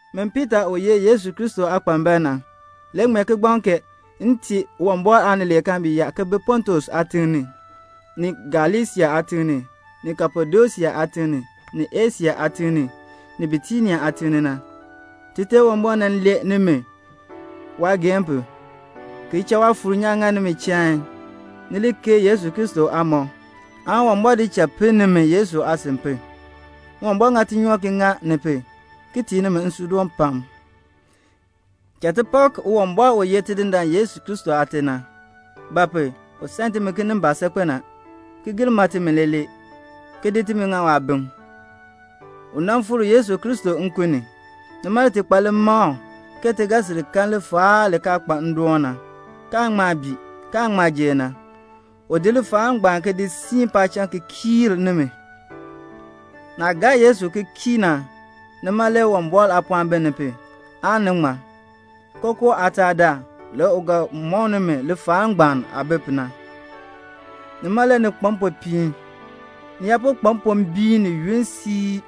Min Piita u ye Yesu Kristo aakpambal na, m ŋmee kigbaŋ kee m tii Uwumbɔr aanileekaan bi yaa ki bi Pontus aatiŋ ni, ni Galasia aatiŋ ni, ni Kapadosia aatiŋ ni, ni Asia aatiŋ ni, ni Bitinia aatiŋ ni na. Tite Uwumbɔr nan lee nimi waageehn pu, ki cha Waafuur nyaan ŋa nimi chain, ni li keei Yesu Kristo aamɔb, aan Uwumbɔr di cha pinn nimi Yesu aasin pu. Uwumbɔr ŋa tinyoor ki ŋa ni pu, ki tii nimi nsuudoon pam. Cha ti pak Uwumbɔr u ye Tidindaan Yesu Kristo Aate na; ba pu? u san timi kinimbaak saakpen a, ki gir ma timi leelee, ki di timi ŋa waabim. U nan fikr Yesu Kristo nkun ni. Nima le ti kpa limakl ke ti ga sil kan lifaal li kaa kpa ndoon na, kaan ŋma bii, kaan ŋma jer na. U di lifaal ngbaan ki di siin paacham ki kii nimi. Naah gaa Yesu ki kii na, nima le Uwumbɔr aapɔɔn biin ni pu, aan ni ŋmar. Kookoo aataadaal, le u ga mɔk nimi lifaal ngbaan aah bi pu na. Nima le ni kpa mpopiin. Ni yaa po kpa mpombiin ni yunn siib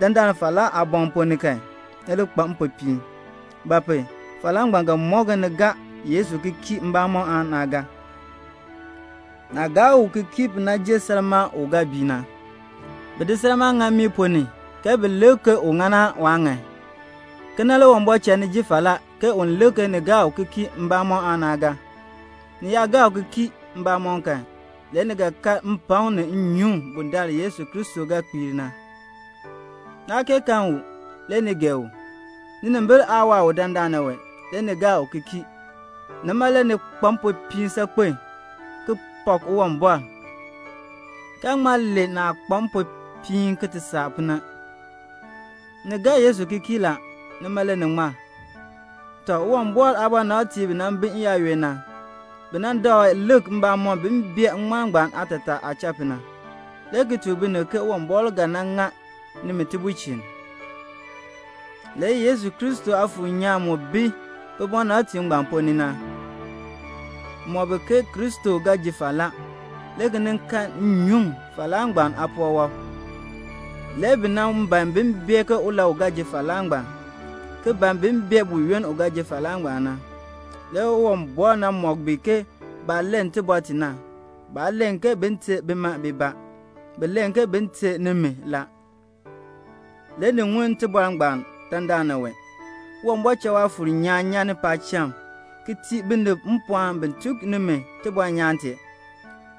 dandana wee falaa aaboŋ ponn ni kan, ni li kpa mpopiin; ba pu? falaa ngbaan ga mɔk ke ni gaa Yesu ki kii mbamɔm aan naa gaa. Naah gaa u ki kii pu na jer salmaa u ga bii na. Bi di salmaa ŋa mmii ponn ni ke bin lik ke u ŋan aan waa ŋan. Kena le Uwumbɔr cha ni ji falaa ke un lik ke ni gaa u ki kii mbamɔm aan naa gaa. Ni yaa gaa u ki kii mbamɔm kan, le ni ga kan mpakm ni nnyuŋ bundaln Yesu Kristo ga kpiir na. Naa kee kan u, le ni gee u. Ninimbil aa waa u dandana wee, le ni gaa u ki kii. Nima le ni kpa mpopiin saakpen, ki pak Uwumbɔr, kaa ŋma len naah kpa mpopiin ki ti saa pu na. Ni gaa Yesu ki kii la. Nima le ni ŋmar. Tɔ, Uwumbɔr aabɔnabtiib bi nan bi n-yaayoonn na, bi nan dakl lik mbamɔm bin bee ŋŋmarm ngbaan aatataa aah cha pu na, le ki tuk binib ke Uwumbɔr ga nan ŋa nimi tibulchin. Le Kristo Aafuur nyaan mu bi bibɔnabtiib ngbaan ponn ni na mɔk bi ke Kristo ga ji falaa, le ki nin kan nnyuŋ falaa ngbaan aapuwɔb. Le bi nan ban bin bee ke ulau ga ji falaa ngbaan, ki ban bin bee buyoonn u ga ji falaa ngbaan na. Le Uwumbɔr nan mɔk bi ke baah len tibɔr ti na, baa len ke bin ter bima bibaa, bi len ke bin ter nimi la. Le ni ŋun tibɔr ngbaan dandana wee. Uwumbɔr cha Waafuur nyaan nyan ni paacham ki tii binib mpɔɔn bin tuk nimi tibɔnyaan tee.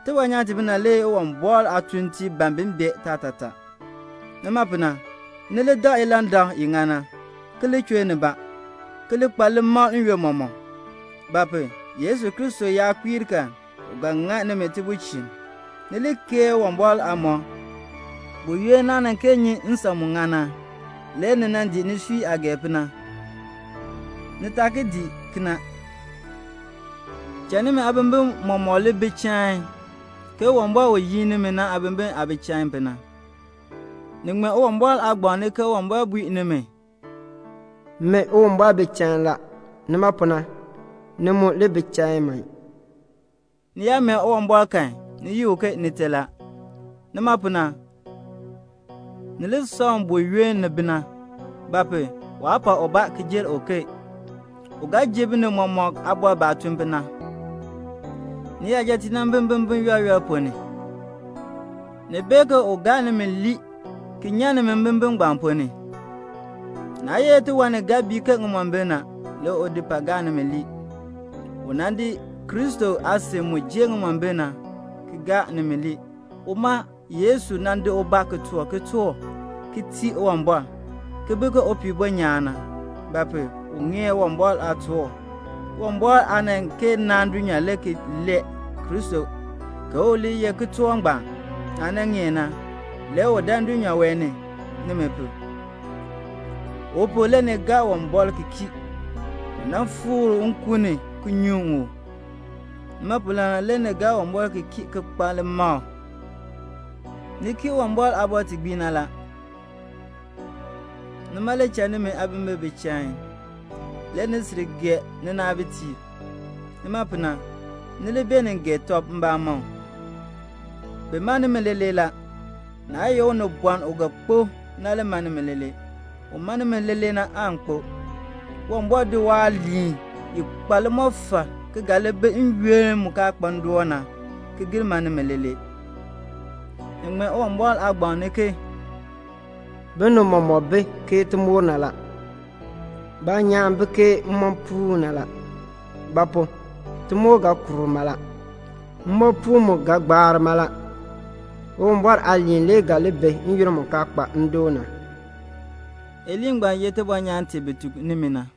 Tibɔnyaan timina le Uwumbɔr aatuuntiib ban bin bee taatataa. Nima pu na, ni li dak ilandak i ŋan na, ki li chur nibaa, ki li kpa limakl n-yoonn mɔmɔk; ba pu? Yesu Kristo yaa kpiir kan, u ga ŋa nimi tibulchin. Ni li keei Uwumbɔr aamɔb. Buyoonn naah kaa nan kee nyi nsan mu ŋan na, le ni nan dii nisui aah gee pu na. Ni taa ki dii kena. Cha nimi aabimbin mɔmɔk li bi chain, ke Uwumbɔr u yin nimi na aabimbin aah bi chain pu na. Ni ŋmee Uwumbɔr aagbaŋ ni ke Uwumbɔr bui nimi, "Min Uwumbɔr bi chain la; nima pu na ni mu li bi chain man." Ni yaa mee Uwumbɔr kan, ni yi u ke Nite la. Nima pu na, ni li san u buyoonn ni bi na; ba pu? waa pak ubaa ki jer uken. U ga ji binib mɔmɔk aabɔr baah tun pu na. Niyajatiib nan bi mbimbin yɔl yɔl ponn ni. Ni bee ke u gaa nimi lii ki nyan nimi mbimbin ngbaan ponn ni. Naa ye tiwan ni ga bii ke ŋimombil na, le u di ki pai ki gaa nimi lii. U nan di Kristo aasin mu jer ŋimombil na, ki gaa nimi lii; uma Yesu nan di ubaa ki toor kitork ki tii Uwumbɔr, ki bi ke upihbo nyaan na; ba pu? u ŋeer Uwumbɔr aatork. Uwumbɔr aa nan kee naan dulnyaa le ki lee Kristo ke u li ye kitork ngbaan. Naah nan ŋeer na, le u dan dulnyaa wee ni, nimi pu. U pu, le ni gaa Uwumbɔr ki kii. U nan fikr u nkun ni ki nyuŋ u. Nima pu na le ni gaa Uwumbɔr ki kii ki kpa limakl. Ni kii Uwumbɔr aabɔr ti gbii na la. Nima le cha nimi aabimbin bi chain. Le ni sil gee ninaabitiib. Nima pu na, ni li beenin gee tɔb mbamɔm. Bi ma nimi leelee la. Naa ye unibɔn u ga kpo na le ma nimi leelee. Un ma nimi na aan kpo. Uwumbɔr di waaliin i kpa limɔfal ki ga li bi n-yoonn mu kaa kpa ndoon na, ki gir ma nimi leelee. Ni ŋmee Uwumbɔr aagbaŋ ni ke "Binib mɔmɔk bi ke timoor na. Baanyaan bi ke mmoopuun na. Ba pu? timoor ga kuur mala. Mmoopuun mu ga gbaar mala; Uwumbɔr aaliin le ga li bi n-yoonn mu kaa kpa ndoon na." Iliin ngbaan ye tibɔnyaan ti bi tuk nimi na.